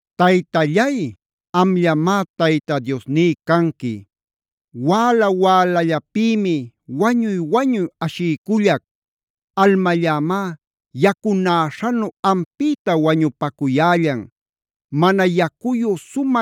Taytallay, amllamá Tayta Diosní canqui. Wäla-wälallapïmi wañuy-wañuy ashiycullac. Almallämá yacunäśhanu ampïta wañuyan. Mana yacuyu,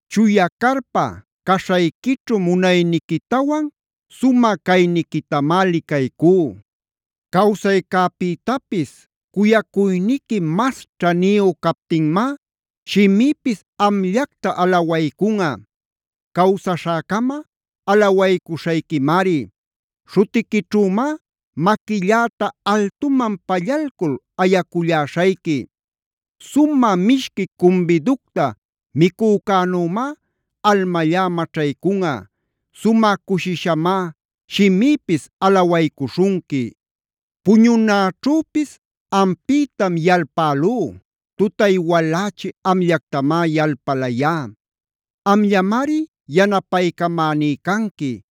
Chuya carpa caśhayquićhu munayniquitawan sumä cayniquitamá licaycú. Cawsaycäpïtapis cuyacuyniqui mas ćhaniyu captinmá shimïpis amllacta alawaycunꞌa. Cawsaśhäcama alawaycuśhayquimari. Śhutiquićhümá maquilläta altuman pallalcul ayaculläśhayqui. Sumä mishqui cumbiducta micücänümá almallá maćhaycunꞌa. Sumä cushishamá shimïpis alawaycuśhunqui: Puñunäćhüpis ampïtam yalpälú. Tutay walächi amllactamá yalpalayá. Amllamari yanapaycamäní canqui.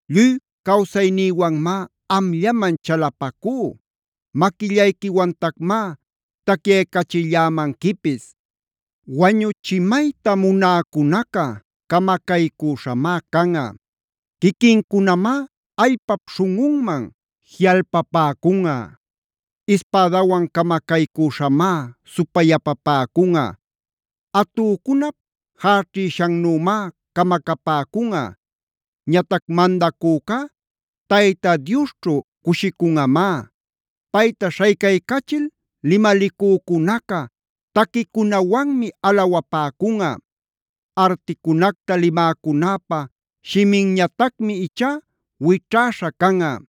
Lluy cawsaynïwanmá amllaman chalapacú. Maquillayquiwantacmá tacyaycachillämanquipis. Wañuchimayta munäcunaca camacaycüśhamá canꞌa. Quiquincunamá allpap śhunꞌunman jiꞌalpapäcunꞌa. Ispädawan camacaycüśhamá supayapapäcunꞌa. Atücunap jäćhïshannümá camacapäcunꞌa. Ñatac mandacücá Tayta Diosćhu cushicunꞌamá. Payta śhaycaycachil limalicücunaca taquicunawanmi alawapäcunꞌa. Articunacta limäcunäpa shiminñatacmi ichá wićhäśha canꞌa.